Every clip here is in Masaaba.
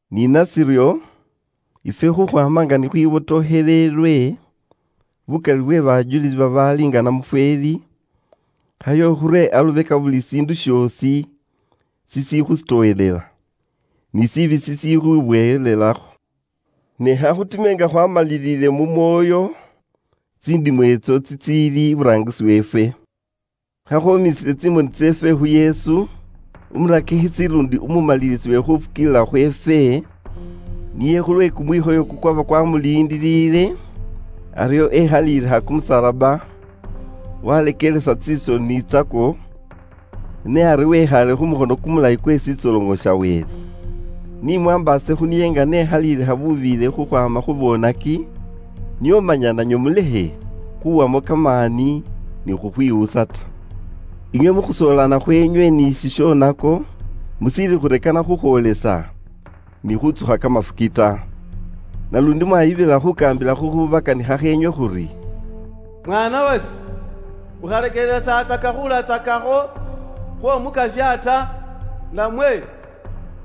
Ni nashiryo, ifwe khukhwaama nga bukali bwe bajulisi babaali nga namufweeli ni bakhwibotokheleele ifwe, khayo nafwe khure alubeka buli shiindu shoosi shishikhusitowelela, ni shishoonako shishikhwibowelelakho, ne khakhutime nga khwaamaliliile mu mwoyo tsindimo itso tsitsiili iburaangisi weefwe. Khakhwoomisile tsimoni tseefwe khu Yesu, umurakikhisi luundi umumalilisi we khuufukiilila khweefwe, niye khulwe kumwikhoyo kukwaba kwaamuliindiliile, aryo ekhaliilikha kumusalaba, waleekelesa tsisoni tsakwo, ne ari wekhaale khu mukhono kumulayi kwe shitsoloŋo sha Wele. Ni mumwaambaase khu niye nga n'ekhaliilikha bubiiyile khukhwaama khu boonaki, nio manya nanywe kimyoyo kyeenywe kilekhe khuwamo kamaani ni khukhwiwusa ta. Inywe mu khusoolana khweenywe ni shishoonako mushiili khurekana khukhwoolesa ni khuutsukha kamafuki ta. Naluundi mwaayibilila khuukaambila khukhubakanikhakho inywe khuri: “Mwaana wase, ukhalekelesatsaka khuulatsakakho khw'Omukasya ta, namwe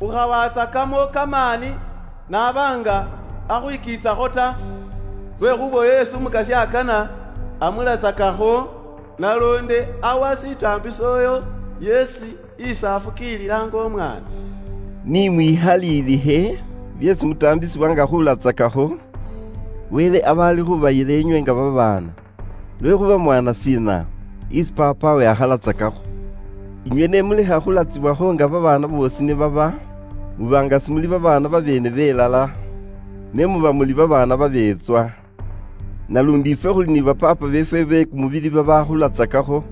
ukhawatsakamo kamaani n'aba nga akhwikiitsakho ta. Lwekhuuba uyo yeesi isi Umukasya akana, amulatsakakho, naluundi awa shitaambiso uyo yeesi isi afukiilila nga umwaana.” Ni mwikhalilikhe byeesi mutaambisibwa nga khulatsakakho, Wele aba ali khubayila inywe nga babaana. Lwekhuuba mwaana shiina isi paapawe akhalatsakakho? Inywe ni mulekha khulatsibwakho nga babaana boosi ni baba, muba nga simuli babaana babeene belala, ne muba muli babaana babeetswa. Naluundi ifwe khuli ni ba paapa beefwe be kumubili babaakhulatsakakho,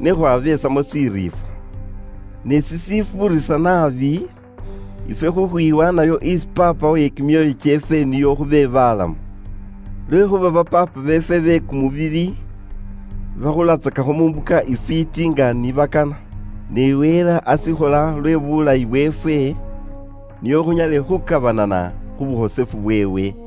ne khwabesamo shiriifwa. Ne sishifuurisa naabi ifwe khukhwiwaanayo isi Paapa we kimyoyo kyeefwe nio khube balamu! Lwekhuuba ba paapa beefwe be kumubili bakhulatsakakho mu mbuka ifwiiti nga ni bakana, ne Wele ashikhola lwe bulayi bweefwe, nio khunyale khukabanana khu bukhosefu bweewe.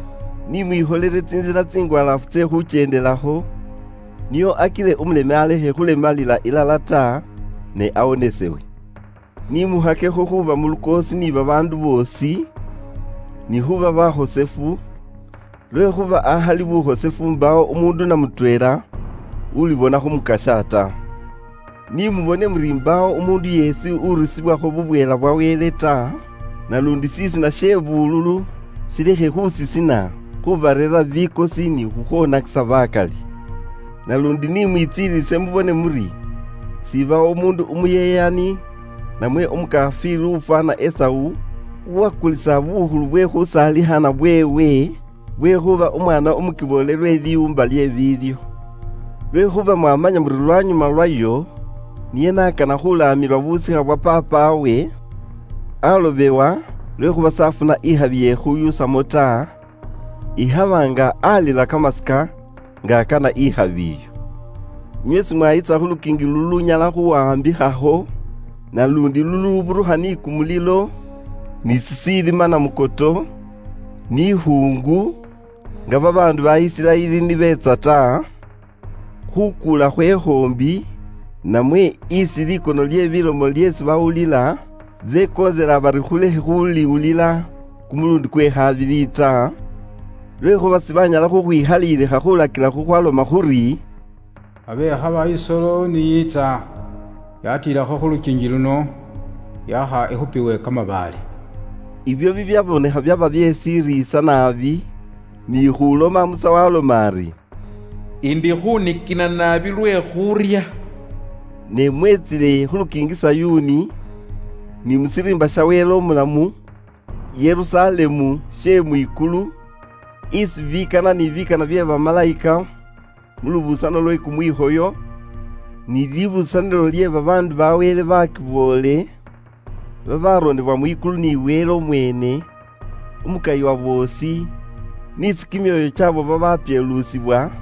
Ni mwikholele tsintsila tsingwalaafu tse khukyendelakho, nio akile umuleme alekhe khulemalila ilala ta, ne awonesewe. Ni mukhakekho khuuba mu lukoosi ni babaandu boosi, ni bulamu bwe khukhwiwaanayo, lwekhuuba akhali khukhwiwaanayo mbaawo umuundu namutweela ulibona khu Mukasya ta. Ni mubone muri mbaawo umuundu yeesi urusibwakho bubweela bwa Wele ta, naluundi shisina she bululu shilekhe khusisina khubareerera bikosi ni khukhwonakisa bakali. Naluundi ikhabawo umuundu umuyeyani namwe ukharya Wele nga Esau n'aaba, uwakulisa bukhulu bwe khusaalikhana bweewe bwe khuuba umwaana umukiboole lwe liwuumba lye biilyo ta. Lwekhuuba inywe mwamanya muri lwanyuma lwayo niye n'akana khukhwiila khu busikha bwa paapawe, baamwikaana lwekhuuba s'afuna ikhabi ye khushuusamo ta, ikhaba nga aalila kamasika nga akana ikhabi iyo. Inywe simwayitsa khu lukiingi lulunyala khuuwaambikhakho, naluundi luluburukha ni kumulilo, ni shishilima namukoto, ni ikhuungu, nga babaandu ba Isiraeli ni beetsa ta, khukuula khwe khoombi, namwe isi likono lye bilomo lyeesi bawulila, bekontselela bari balekhe khuliwulila kumuluundi kwe khabili ta, lwekhuuba sibanyala khukhwikhalilikha khuulakila khukhwaloma khuri: “Abe ikhaba isolo ni yiitsa yatiilakho khu lukiingi luno, yaakha ikhupiwe kamabaale.” Ibyo bibyabonekha byaba bye shiriisa naabi, ni khuushilomakho, Musa waaloma ari, “Indi khuunikina naabi lwe khuurya.” Ne mwetsile khu lukiingi Sayuuni, ni mu shiriimba sha Wele umulamu, Yerusalemu she mwikulu, isi bikana ni bikana bye bamalayika mu lubusano lwe kumwikhoyo, ni libusanilo lye babaandu ba Wele baakiboole beesi bawandikhisa kamasiina kaabwe mwikulu isi Wele umweene umukayi wa boosi, n'isi kimyoyo kyaabo babapyeelusibwa,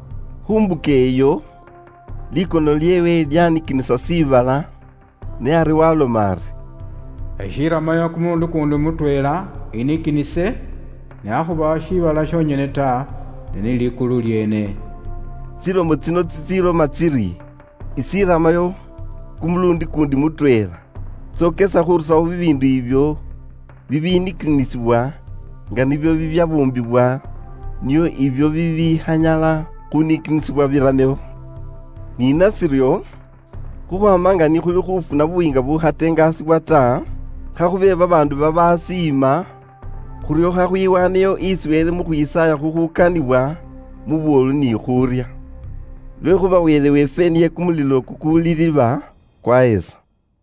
Khu mbuka iyo, likono lyeewe lyanikinisa shiibala, ne ari waaloma ari: “Ishiramayo kumuluundi kuundi mutweela inikinise shibala, ne akhuba shiibala shonyene ta, ne ni likulu lyeene.” Tsilomo tsino tsitsiloma tsiri, “Ishiramayo kumuluundi kuundi mutweela,” tsokesa khuurusawo bibiindu ibyo bibinikinisibwa nga nibyo bibyambuumbibwa nio ibyo bibikhanyala khuunikinisibwa biramewo. Ni nashiryo, khukhwaama nga ni khuli khuufuna buyiinga bubukhatengaasibwa ta, khakhube babaandu babaasiima, khuryo khwihaaneyo isi Wele mu khwisaaya khukhukaniwa mu buwolu ni khuurya. Lwekhuuba Wele weefwe niye kumulilo kukuliliba kwahesa!